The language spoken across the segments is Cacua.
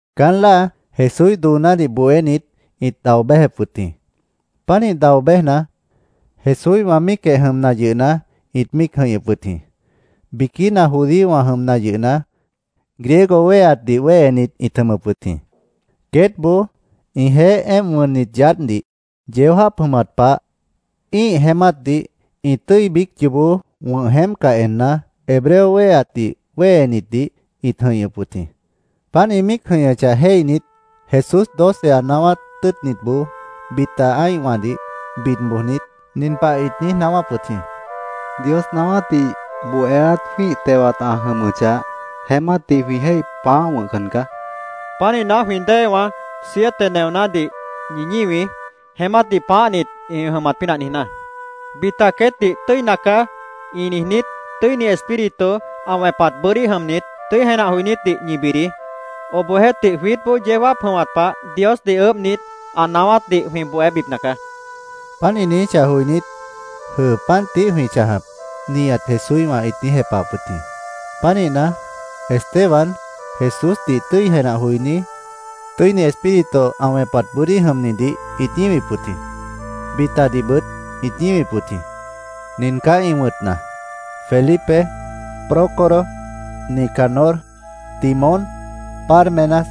Caán láa Jesúíh doonádih bohénit ĩt dao béjep wʉt jĩ. Pánih dao béjna, Jesúíhwã míicjeh jʉmna yʉhna, ĩt míic jʉ̃ihñʉp wʉt jĩ. Biquína judíowã jʉmna yʉhna, Griego wéheatdih wéhenit ĩt jʉmʉp wʉt jĩ. Queétboó ĩjeéh éemp wʉnnit yaádhdih yeó jáap jʉmat pah ĩ́ih jeémátdih ĩ tʉ́i biíc yoobó wʉ̃h jeémpcah enna, Hebreo wéheatdih wéhenitdih ĩt jʉ̃ihñʉp wʉt jĩ. Páant ĩ míic jʉ̃ihñʉchah jéihnit, Jesús doce ã naáwát tʉ́ʉtnitboó bita ã́ihwãdih bid bojnit, nin pah ĩt niíj naáwáp wʉt jĩ: —Dios naáwátdih bohéát jwĩ́ih tewat ã jʉmʉchah, jeémátdih jwĩ jéih pãáhcan caá. Pánihna, jwĩ déewãá, siete neonádih ñi ñíwií, jeémátdih pãáhnit ĩ jʉmat pínah niijná. Bita queétdih ‘Tʉ́init caá’, ĩ niijnít, Tʉ́ini Espíritu ã wẽpat bʉ́dí jʉmnit, tʉ́i jenah joinítdih ñi bidií. Obohjeéhtih, jwiítboó yeó jáap jʉmat pah Diosdih ʉʉ́bhnit, ã naáwátdih jwĩ bohébipna caá, ĩt niijíp wʉt jĩ. Páant ĩ niijíchah joinít, “Jʉ́ʉ. Páant tií jwĩ chãjap”, nihat Jesúíhwã ĩt niíj jepahap wʉt jĩ. Pánihna, Esteban, Jesúsdih tʉ́i jenah joiní, Tʉ́ini Espíritu ã wẽpat bʉ́dí jʉmnidih ĩt ñíwip wʉt jĩ. Bitadihbʉt ĩt ñíwip wʉt jĩ. Nin caá ĩ wʉ̃tna: Felipe, Prócoro, Nicanor, Timón, Pármenas,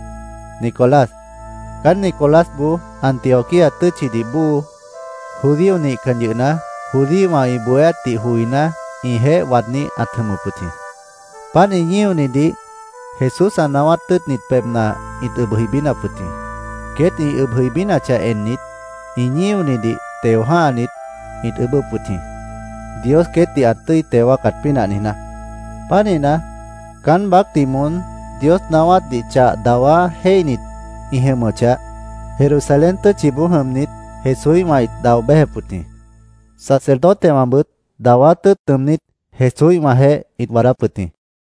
Nicolás. Caán Nicolásboó Antioquía tʉ́tchidih bóo judío nihcan yʉhna, judíowã ĩ bohéátdih joiná, ĩjeéh waadní ãt jʉmʉp wʉt jĩ. Páant ĩ ñíonitdih Jesús ã naáwát tʉ́ʉtnit pebhna ĩt ʉb jʉibínap wʉt jĩ. Queét ĩ ʉb jʉibínachah ennit, ĩ ñíonitdih teo jã́hanit, ĩt ʉʉ́bʉ́p wʉt jĩ, Dios queétdih ã tʉ́i teo wáacat pínah niijná. Pánihna, caán baácdih moón Dios naáwátdih chah dawá jéihnit ĩ jʉmʉchah, Jerusalén tʉ́tchiboó jʉmnit Jesúíhwã ĩt dao béjep wʉt jĩ. Sacerdotewãbʉt dawá tʉ́ʉt nʉʉmnít, Jesúíhwãjeéh ĩt waadáp wʉt jĩ.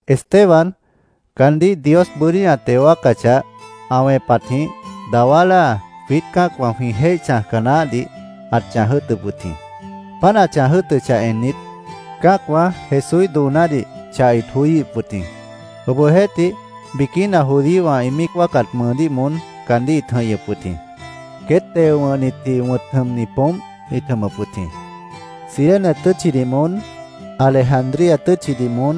Esteban, caandíh Dios bʉ́dí ã teo wáacachah, ã wẽpatjĩh dawá láa jwiít cã́acwã jwĩ jéih chãjca naáhdih ãt chãj jʉ́ʉtʉp wʉt jĩ. Páant ã chãj jʉ́ʉtʉchah ennit, cã́acwã Jesúíh doonádih chah ĩt joííhip wʉt jĩ. Obohjeéhtih, biquína judíowã ĩ míic wáacat mʉʉdíh moón caandíh ĩt jʉ̃ihñʉp wʉt jĩ. Queét Teo Wʉ̃hnitji wʉ̃t jʉmni poómp ĩt jʉmʉp wʉt jĩ. Cirene tʉ́tchidih moón, Alejandría tʉ́tchidih moón,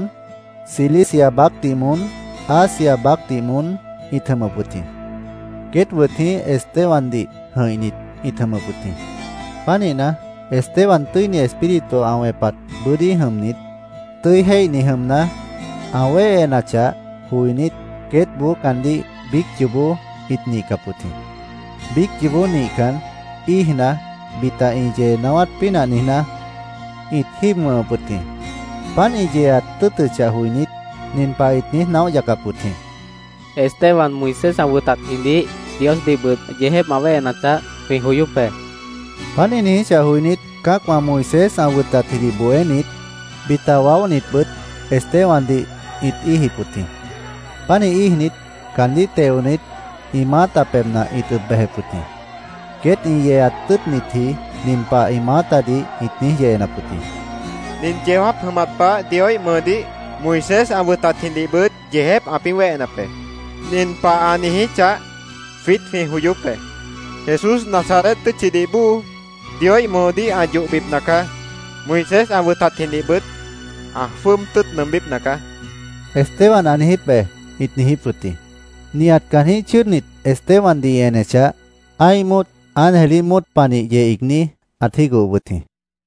Cilicia baácdih moón, Asia baácdih moón ĩt jʉmʉp wʉt jĩ. Queét wʉt jĩí Estebandih jʉ̃ihnit ĩt jʉmʉp wʉt jĩ. Pánihna, Esteban Tʉ́ini Espíritu ã wẽpat bʉ́dí jʉmnit, tʉ́i jéihni jʉmna, ã wéhenachah joinít, queétboó caandíh biíc yoobó ĩt nihcap wʉt jĩ. Biíc yoobó nihcan, íijna, bita ĩ yee naáwát pínah niijná, ĩt jíib wʉ̃hʉp wʉt jĩ. Páant ĩ yeeat tʉ́ʉtʉchah joinít, nin pah ĩt niíj naóh yacap wʉt jĩ: “Esteban Moisés ã wʉtatjidih Diosdihbʉt yeejép ã wéhenachah, jwĩ joyóp be”, ĩt niíj yeenap wʉt jĩ. Páant ĩ niijíchah joinít, cã́acwã, Moisés ã wʉtatjidih bohénit, bita waóhnitbʉt Estebandih ĩt íijip wʉt jĩ. Pánih íijnit, caandíh teonit, ĩ maáta pebhna ĩt ʉb bejep wʉt jĩ. Queét ĩ yeeat tʉ́ʉtnitji nin pah ĩ maátadih ĩt niíj yeenap wʉt jĩ: —Nin yeó jáap jʉmat pah Dioíh mʉʉdíh, Moisés ã wʉtatjidihbʉt yeejép ãpĩ́ wéhenap be. Nin pah ã niijíchah, jwiít jwĩ joyóp be: ‘Jesús Nazaret tʉ́tchidih bóo Dioíh mʉʉdíh ã yohbipna caá. Moisés ã wʉtatjidihbʉt ã jwʉ́ʉb tʉ́ʉt nʉʉmbípna caá’, Esteban ã niijíp be, ĩt niijíp wʉt jĩ. Nihat caanjĩ́h chʉ́ʉdnit Estebandih ĩ enechah, ã́ih móot ángelíh móot panih yeh iigní ãt jígohop wʉt jĩ.